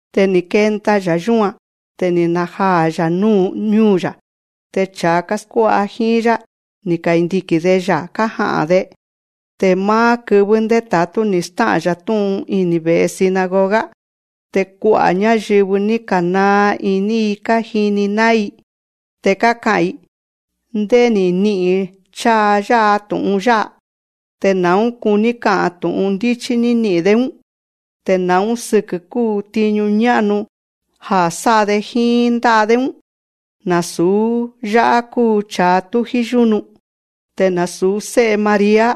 Te ni̱ kenda‑ya̱ yúan. Te ni̱ najaa̱‑ya̱ ñúu̱‑ya̱. Te cha̱a káskuá'a jíín‑yá, ni̱ kandiki̱n‑de‑ya̱ kája'a̱n‑de. Te máá kɨvɨ́ ndéta̱tú ni̱ stá'a̱n‑ya̱ tú'un ini̱ ve̱'e sinagoga. Te kua'a̱ ñáyɨvɨ, ni̱ ka̱naa iní‑i kájini ná'ín‑i. Te káka'a̱n‑i: Ndé ni̱ ni'i̱n cháa yá'a tu̱'un yá'a. Te na̱ún kuní ka'a̱n tu̱'un ndíchí ní ni'i̱n‑dé‑ún. Te na̱ún sɨkɨ̱ kúu tiñu ñá'nu ja̱ sá'a‑de jíín ndá'a‑dé‑ún. Nasu̱ yá'á kúu cha̱a tújí yúnu. Te nasu̱ sé'e María,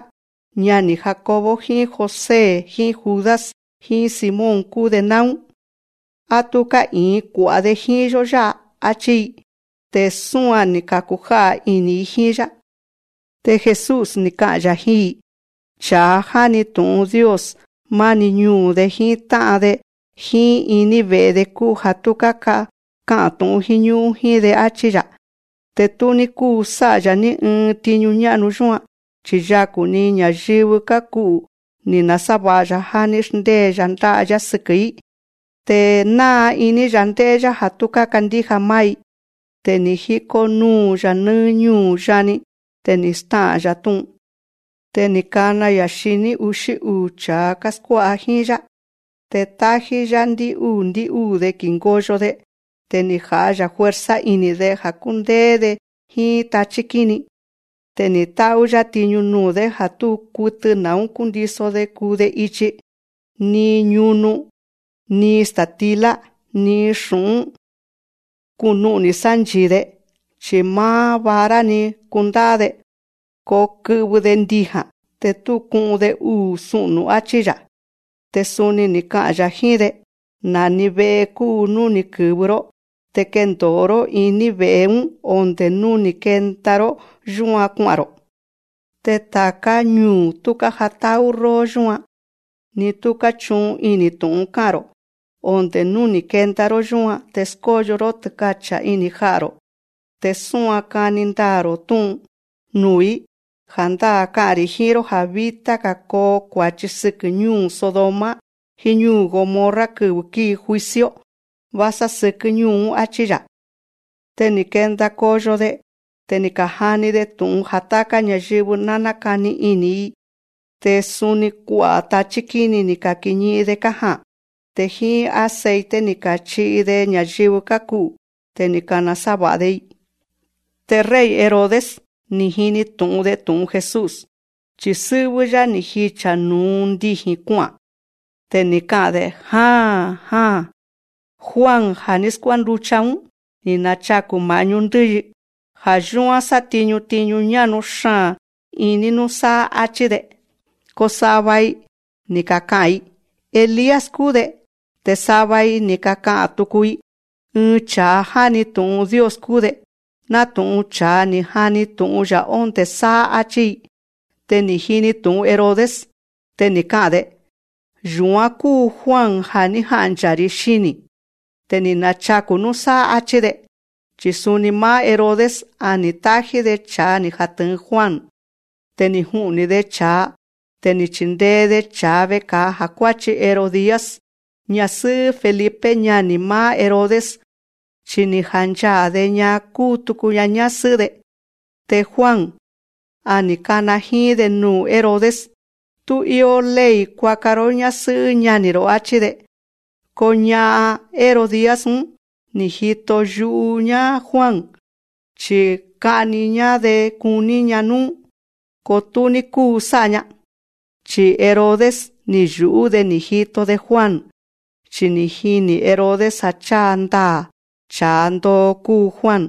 ñani̱ Jacobo jíín José jíín Judas jíín Simón kúu‑de náún. Á tú ká'i̱in kua̱'a‑de jíín‑yó yá'a, áchí‑i. Te súan ni̱ ka̱kujá'a̱ ini̱‑i jíín‑yá. Te Jesús, ni̱ ka'a̱n‑ya̱ jíín‑i: Cha̱a jáni tu̱'un Dios, máni ñuu̱‑de jíín tá'an‑de jíín iní ve̱'e‑de kúu ja̱ tú káka'a̱n tu̱'un jíñú'ún jíín‑de, áchí‑ya̱. Te tú ní kúu sá'a‑ya̱ ní ɨɨn tiñu ñá'nu yúan. Chi̱ yaku̱‑ni ña̱yɨvɨ káku'u̱ ni̱ nasáva̱'a‑ya̱, já ní xndée‑ya̱ ndá'a‑yá sɨkɨ̱‑í. Te náa iní‑ya̱ ndé'é‑yá ja̱ tú kákandíja máá‑i. Te ni̱ jíkó núu‑ya̱ nɨ́ɨ́ ñúu̱ yani. Te ni̱ stá'a̱n‑ya̱ tú'un. Te ni̱ kana‑ya̱ xiní uxí uu̱ cha̱a káskuá'a jíín‑yá. Te tájí‑yá ndɨ́'úu̱ ndɨ́'úu̱‑de ki̱ngoyo‑de. Te ni̱ ja̱'a‑ya̱ fuerza ini̱‑de ja̱ kúndéé‑de jíín tachí kíni. Te ni̱ tá'ú‑yá tiñu nuu̱‑dé ja̱ tú kutɨ na̱ún kúndiso‑de kuu‑de ichi. Ni ñunu, ni sta̱tilá, ni xu̱'ún kúnu'ni̱ sánchi̱i‑de. Chi̱ máá vara‑ni kundá'á‑de. Ko kɨ'vɨ‑de ndija̱n. Te tú ku'un‑de uu̱ su'nu̱, áchí‑ya̱. Te suni ni̱ ka'a̱n‑ya̱ jíín‑de: Na̱ni ve'e kúu nú ni̱ kɨ̱vɨ‑ró, te kendo̱o‑ró iní ve̱'e‑ún onde̱ nú ni̱ kenda‑ró yúan kua'a̱n‑ro̱. Te ta̱ká ñuu̱ tú kájatá'ú róó yúan, ni tú káchu'un ini̱ tu̱'un ká'a̱n‑ro̱, onde̱ nú ni̱ kenda‑ró yúan te skóyo‑ró tɨ́kacha̱ iní ja'a̱‑ro̱, te súan kani ndaa̱‑ro̱ tú'un nuu̱‑í. Ja̱ndáa̱ ká'a̱n‑ri̱ jíín‑ró ja̱ vítá‑ga̱ koo kua̱chi sɨkɨ̱ ñúu̱ Sodoma jíín ñúu̱ Gomorra kɨvɨ̱ kíi juicio, vásá sɨkɨ́ ñúu̱‑ún, áchí‑ya̱. Te ni̱ kenda koyo‑de. Te ni̱ ka̱jani‑de tu̱'un ja̱ táká ña̱yɨvɨ ná nákani ini̱‑i. Te suni kua'a̱ tachí kíni ni̱ ka̱kiñi'in‑de kája'a̱n. Te jíín aceite ni̱ ka̱chi'i‑de ña̱yɨvɨ káku'u̱, te ni̱ ka̱nasáva̱'a‑de‑i. Te rey Herodes, ni̱ jini tu̱'un‑de tu̱'un Jesús, chi̱ sɨ́'vɨ́‑yá ni̱ jicha̱ nu̱u ndiji̱n kua'a̱n. Te ni̱ ka'a̱n‑de: Ja̱n jaa̱n, Juan ja̱ ní skuánducha‑ún, ni̱ nachaku̱ ma̱'ñú ndɨ́yi. Ja̱ yúán sátiñu tiñu ñá'nu xaa̱n iní núsáá, áchí‑de. Ko sava‑i ni̱ kaka'a̱n‑i: Elías kúu‑de. Te sava‑ga̱‑i ni̱ kaka'a̱n tuku‑i: Ɨɨn cha̱a jáni tu̱'un Dios kúu‑de, nátu̱'un cha̱a ni̱ ka̱jani tu̱'un‑ya̱ ondé sáá, áchí‑i. Te ni̱ jini tu̱'un Herodes. Te ni̱ ka'a̱n‑de: Yu̱án kúu Juan ja̱ ní janchaa̱‑ri̱ xini̱, te ni̱ nachaku̱ núsáá, áchí‑de. Chi̱ suni máá Herodes, a ni̱ tájí‑de cha̱a ni̱ jatɨ̱ɨn Juan. Te ni̱ ju'ni̱‑de cha̱a. Te ni̱ chindee‑de cha̱a veka̱a ja̱ kuáchi Herodías, ñasɨ́'ɨ́ Felipe ñani̱ máá Herodes. Chi ni̱ janchaa̱‑de‑ña kúu tuku‑ña ñásɨ́'ɨ́‑de. Te Juan, a ni̱ kana jíín‑de nuu̱ Herodes: Tú íó ley kuaka‑ró ñásɨ́'ɨ́ ñani̱‑ro̱, áchí‑de. Ko ña'an, Herodías‑ún, ni̱ jito yu'u‑ñá Juan, chi̱ ka'ni‑ñá‑de kuní‑ña núú. Ko tú ní kúu sá'a‑ña. Chi̱ Herodes, ni̱ yu̱'ú‑de ni̱ jito‑de Juan, chi̱ jiní Herodes ja̱ cháa ndaa̱ cha̱a ndoo kúu Juan.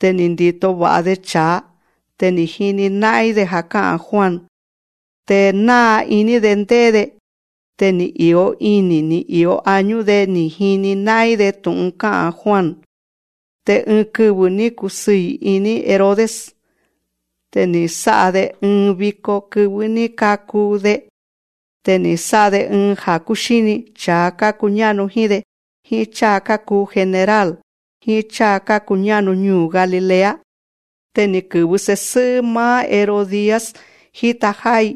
Te ni̱ ndi̱to va̱'a‑de cha̱a. Te jíni ná'ín‑de ja̱ ká'a̱n Juan, te náa iní‑de ndé'é‑de. Te ni̱ i̱o ini̱ ni̱ i̱o añú‑de ni̱ jini ná'ín‑de tu̱'un ká'a̱n Juan. Te ɨɨn kɨvɨ̱ ní kusɨɨ̱ iní Herodes. Te ni̱ sá'a‑de ɨɨn viko kɨvɨ́ ní kaku‑de. Te ni̱ sá'a‑de ɨɨn ja̱ kúxíni cha̱a kákuñá'nu jíín‑de, jíín cháa kákuu general, jíín cháa kákuñá'nu ñuu̱ Galilea. Te ni̱ kɨ̱vɨ se̱sɨ́'ɨ́ máá Herodías jíta já'á‑i.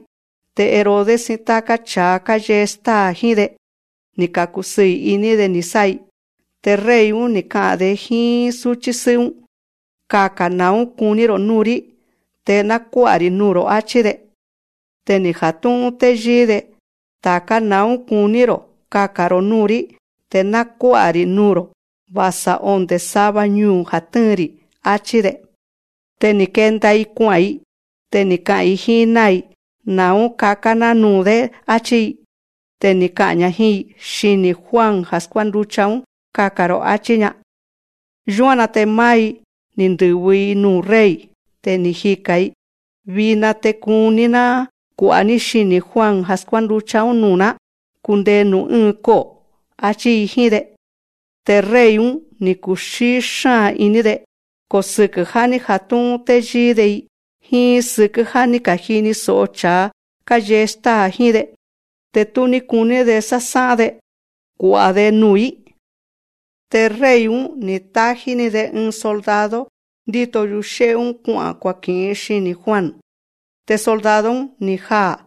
Te Herodes jíín táká cha̱a káyee stáa̱ jíín‑de, ni̱ ka̱kusɨɨ̱ iní‑de ni̱ sá'a‑i. Te rey‑ún, ni̱ ka'a̱n‑de jíín súchí sɨ́'ɨ́‑ún: Kaka̱n na̱ún kuní‑ro̱ núu̱‑rí te ná kuá'a‑ri̱ nuu̱‑ro̱, áchí‑de. Te ni̱ jatu̱'un téyíí‑de: Ta̱ká na̱ún kuní‑ro̱ kakán‑ro̱ núu̱‑rí te ná kuá'a‑ri̱ nuu̱‑ro̱, va̱sa onde̱ sava ñuu̱ ja̱ tɨ́ɨn‑ri̱, áchí‑de. Te ni̱ kenda‑i kua'a̱n‑i. Te ni̱ ka'a̱n‑i jíín náa̱‑i: Na̱ún kakán‑ná nuu̱‑dé, áchí‑i. Te ni̱ ka'a̱n‑ña jíín‑i: Xini̱ Juan ja̱ skuánducha‑ún kaka̱n‑ro̱, áchí‑ña. Yúan‑na te máá‑i, ni̱ ndɨ̱vɨ‑ni‑i nuu̱ rey. Te ni̱ jika̱n‑i: Vina nchaa te kuní‑ná kua̱'a‑ní xini̱ Juan ja̱ skuánducha‑ún nuu̱‑ná kundee nuu̱ ɨ́ɨn ko'o̱, áchí‑i jíín‑de. Te rey‑ún, ni̱ kuxíí xáa̱n iní‑de. Ko sɨkɨ̱ já ní jatu̱'un téyíí‑de, jíín sɨkɨ́ já ní ka̱jini so̱'o cha̱a káyee stáa̱ jíín‑de, te tú ní kuní‑de sásá'án‑de kua̱'a‑de nuu̱‑í. Te rey‑ún, ni̱ tájí‑ni‑de ɨɨn soldado ndíto yuxé'é‑ún kua'a̱n kuaki̱'in xini̱ Juan. Te soldado‑ún, ni̱ ja'a̱n.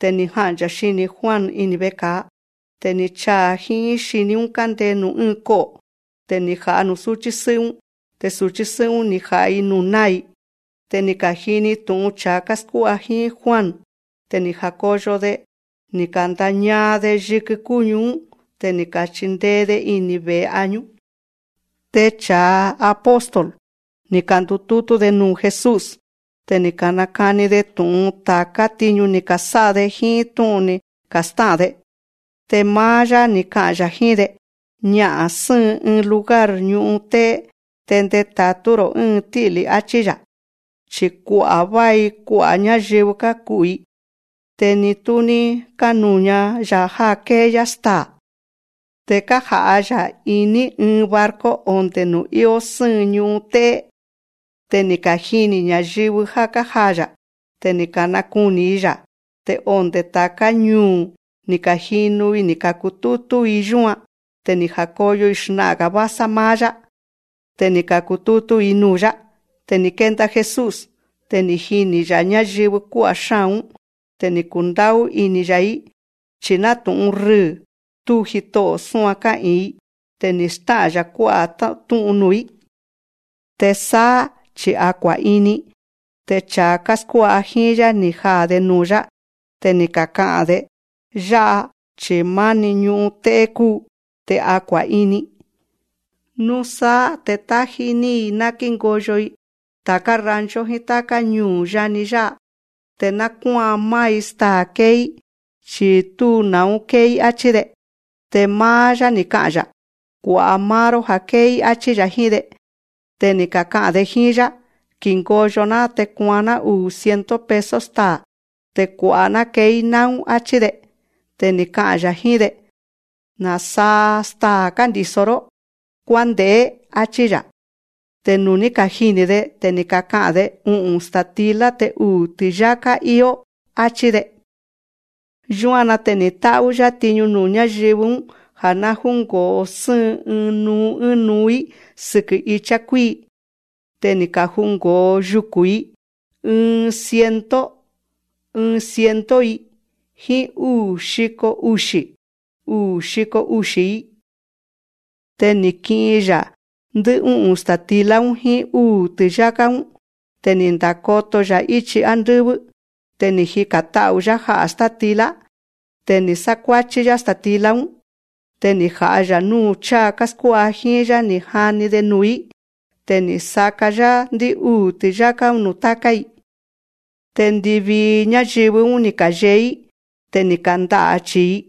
Te ni̱ janchaa̱ xini̱ Juan ini̱ veka̱a. Te ni̱ chaa̱ jíín xiní‑ún kándee nuu̱ ɨ́ɨn ko'o̱. Te ni̱ ja̱'a nuu̱ súchí sɨ́'ɨ́‑ún. Te su̱chí‑ún, ni̱ ja̱'a‑i nuu̱ náa̱‑i. Te ni̱ ka̱jini tu̱'un cha̱a káskuá'a jíín Juan. Te ni̱ ja̱koyo‑de, ni̱ ka̱ndañaa‑de yikɨ kúñu‑ún. Te ni̱ ka̱chindee‑de ini̱ ve̱'e añú. Te cha̱a apóstol, ni̱ ka̱ndutútú‑de nuu̱ Jesús. Te ni̱ ka̱nakani‑de tu̱'un ta̱ká tiñu ni̱ ka̱sá'a‑de, jíín tú'un ni̱ ka̱stá'a̱n‑de. Te máá‑yá, ni̱ ka'a̱n‑ya̱ jíín‑de: Ña'a̱n sɨ́ɨn ɨɨn lugar ñu'un té'é, te ndeta̱tú‑ro̱ ɨ́ɨn tí'lí, áchí‑ya̱. Chi̱ kua'a̱n va̱i kua'a̱ ñáyɨvɨ kákuu‑i. Te ni tú ní kánuña‑ya̱ já kée‑yá staa̱. Te kája'a̱n‑ya̱ iní ɨɨn barco onde̱ nuu̱ íó sɨ́ɨn ñu'un té'é. Te ni̱ kajini̱ ña̱yɨvɨ já kája'a̱n‑ya̱. Te ni̱ ka̱nakuni̱‑i‑ya̱. Te onde̱ ta̱ká ñuu̱ ni̱ ka̱jinu‑i ni̱ ka̱kutútú‑i yúan. Te ni̱ ja̱koyo‑i xna'a̱n‑ga̱ vásá máá‑yá. Te ni̱ ka̱kutútú‑i nuu̱‑yá. Te ni̱ kenda Jesús. Te ni̱ jini̱‑ya̱ ñáyɨvɨ kuá'a̱ xáa̱n‑ún. Te ni̱ kundá'ú ini̱‑ya̱‑í, chi̱ nátu̱'un rɨɨ̱ tú jito'o̱ súan ká'i̱in‑i. Te ni̱ stá'a̱n‑ya̱ kuá'a̱ tú'un nuu̱‑í. Te sáá chi̱ a kua̱'ini, te cha̱a káskuá'a jíín‑yá, ni̱ jaa̱‑de nuu̱‑yá. Te ni̱ kaka'a̱n‑de: Yá'a chi̱ máá ñú'un té'é kúu, te a kua̱'ini. Núsáá te tájí‑ní‑i ná kíngoyo‑i ta̱ká rancho jíín táká ñuu̱ yani yá'a, te ná kuáan máá‑i staa̱ kée‑í, chi̱ tú na̱ún kée‑í, áchí‑de. Te máá‑yá, ni̱ ka'a̱n‑ya̱: Kua̱'a máá‑ró já kée‑í, áchí‑ya̱ jíín‑de. Te ni̱ kaka'a̱n‑de jíín‑yá: Ki̱ngoyo‑ná te kuaan‑ná uu̱ ciento peso staa̱ te kua̱'a‑ná kee‑í náún, áchí‑de. Te ni̱ ka'a̱n‑ya̱ jíín‑de: Na̱saa staa̱ kándi̱so‑ró. Kuánde̱'é, áchí‑ya̱. Te nuu̱ ní kajini̱‑de, te ni̱ kaka'a̱n‑de: U'u̱n sta̱tilá te uu̱ ti̱yáká íó, áchí‑de. Yúan‑na te ni̱ tá'ú‑yá tiñu nuu̱ ñáyɨvɨ‑ún ja̱ ná júngo̱o sɨ́ɨn ɨɨn nuu ɨ́ɨn nuu‑í sɨkɨ̱ ichá kuíi. Te ni̱ kaju̱ngo̱o yuku̱n‑i, ɨɨn ciento, ɨɨn ciento‑i, jíín úu̱ xiko uxi̱, uu̱ xiko uxi̱‑i. Te ni̱ ki'in‑ya̱ ndɨ́'ú'u̱n sta̱tilá‑ún jíín úu̱ ti̱yáká‑ún. Te ni̱ ndakoto‑ya̱ íchi ándɨ́vɨ́. Te ni̱ jika̱n ta'u̱‑yá ja'a̱ státilá. Te ni̱ sákuáchí‑yá sta̱tilá‑ún. Te ni̱ ja̱'a‑ya̱ núu̱ cháa káskuá'a jíín‑yá ni̱ ka̱jani‑de nuu̱‑í. Te ni̱ saka‑yá ndɨ́'úu̱ ti̱yáká‑ún nuu̱ táká‑i. Te ndivii ñáyɨvɨ‑ún, ni̱ ka̱yee‑í. Te ni̱ kanda'a̱ chi̱i‑i.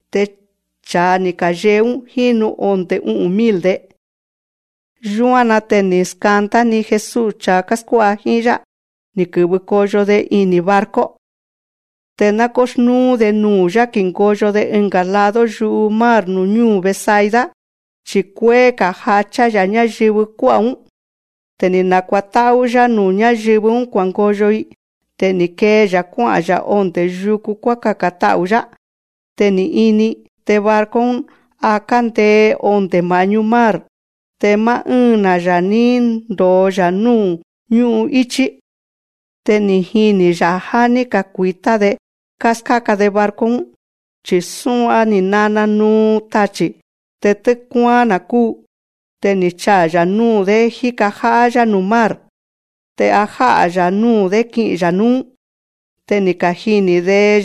Te cha̱a ni̱ ka̱yee‑ún jínu onde̱ u'u̱n mil‑de. Yúan‑na te ni̱ skandá‑ni Jesús cha̱a káskuá'a jíín‑yá, ni̱ kɨ̱vɨ koyo‑de ini̱ barco. Te ná kúxnúú‑de nuu̱‑yá ki̱ngoyo‑de ɨnga̱ lado yu'u mar nuu̱ ñúu̱ Betsaida. Chi̱ kuéé jachá‑ya̱ ñáyɨvɨ kuá'a̱‑ún. Te ni̱ nakuatá'ú‑yá nuu̱ ñáyɨvɨ‑ún kua̱ngoyo‑i. Te ni̱ kee‑ya̱ kuá'a̱n‑ya̱ ondé yuku kuákaka̱n ta'u̱‑yá. Te ni̱ ini, te barco‑ún a kándee onde̱ ma̱'ñú mar. Te máá ɨ́ɨn‑na̱‑ya̱ ní ndo̱o‑ya̱ núu̱ ñú'íchí. Te ni̱ jini̱‑ya̱ já ní kakui̱tá‑de káskáka‑de barco‑ún, chi̱ sua ni̱ nana nuu tachi̱. Te tɨ́kuáán‑na̱ kúu, te ni̱ chaa̱‑ya̱ núu̱‑dé jíka já'á‑yá nuu̱ mar. Te a ja̱'a‑ya̱ núu̱‑dé ki'i̱n‑ya̱ núú. Te ni̱ kajini̱‑de‑ya̱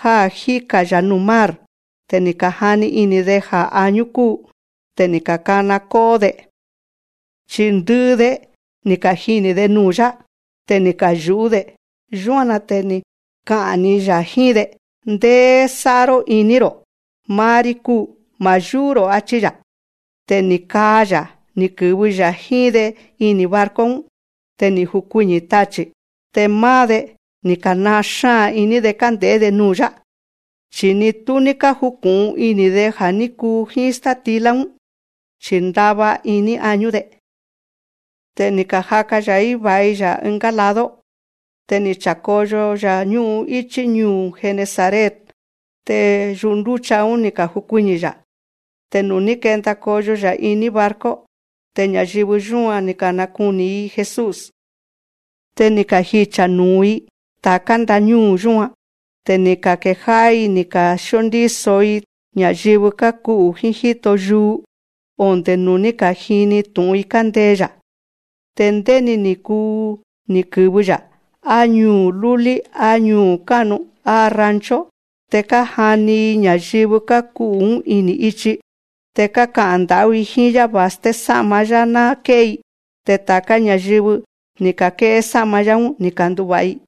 já jíka‑ya̱ núu̱ mar. Te ni̱ ka̱jani ini̱‑de ja̱ añú kúu. Te ni̱ ka̱kana kó'ó‑de. Chi̱ ndɨ'ɨ‑de, ni̱ kajini̱‑de nuu̱‑yá. Te ni̱ kayu̱'ú‑de. Yúan‑na te ni̱ ka'a̱n‑ni‑ya̱ jíín‑de: Ndéé sá'a‑ró iní‑ro̱. Máá‑rí kúu. Ma̱ yú'ú‑ro̱, áchí‑ya̱. Te ni̱ kaa‑ya̱ ní kɨ̱vɨ‑ya̱ jíín‑de ini̱ barco‑ún. Te ni̱ jukuiñi̱ tachi̱. Te máá‑de, ni̱ ka̱naa xáa̱n iní‑de kánde̱'é‑de nuu̱‑yá. Chi̱ ni tú ní kájuku̱'un ini̱‑de ja̱ ní kuu jíín státilá‑ún, chi̱ ndava iní añú‑de. Te ni̱ kaja̱'a‑ya̱ vái‑ya̱ ɨngá lado. Te ni̱ cha̱koyo‑ya̱ ñú'íchí ñúu̱ Genesaret. Te yundúcha‑ún ni̱ ka̱jukuiñi̱‑ya̱. Te nuu̱ ní kenda koyo‑ya̱ iní barco, te ña̱yɨvɨ yúan, ni̱ ka̱nakuni̱‑ni‑i Jesús. Te ni̱ kajicha̱ nu̱u‑i ta̱ká ndañúu̱ yúan. Te ni̱ ka̱kejá'á‑i ni̱ ka̱skuíndíso‑i ña̱yɨvɨ káku'u̱ jíín jíto yuu, onde̱ nuu̱ ní ka̱jini tu̱'un‑i kándee‑ya̱. Te ndéni ni̱ kuu nú ni̱ kɨ̱vɨ‑ya̱, á ñuu̱ lúlí, á ñuu̱ ká'nu, á rancho, te kájani‑i ña̱yɨvɨ káku'u̱‑ún ini̱ ichi. Te káka'a̱n nda̱'ú‑i jíín‑yá va̱sté yúsá'ma‑yá ná ké'é‑i. Te ta̱ká ña̱yɨvɨ ní ka̱ké'é sá'ma‑yá‑ún, ni̱ kandu̱va̱'a‑i.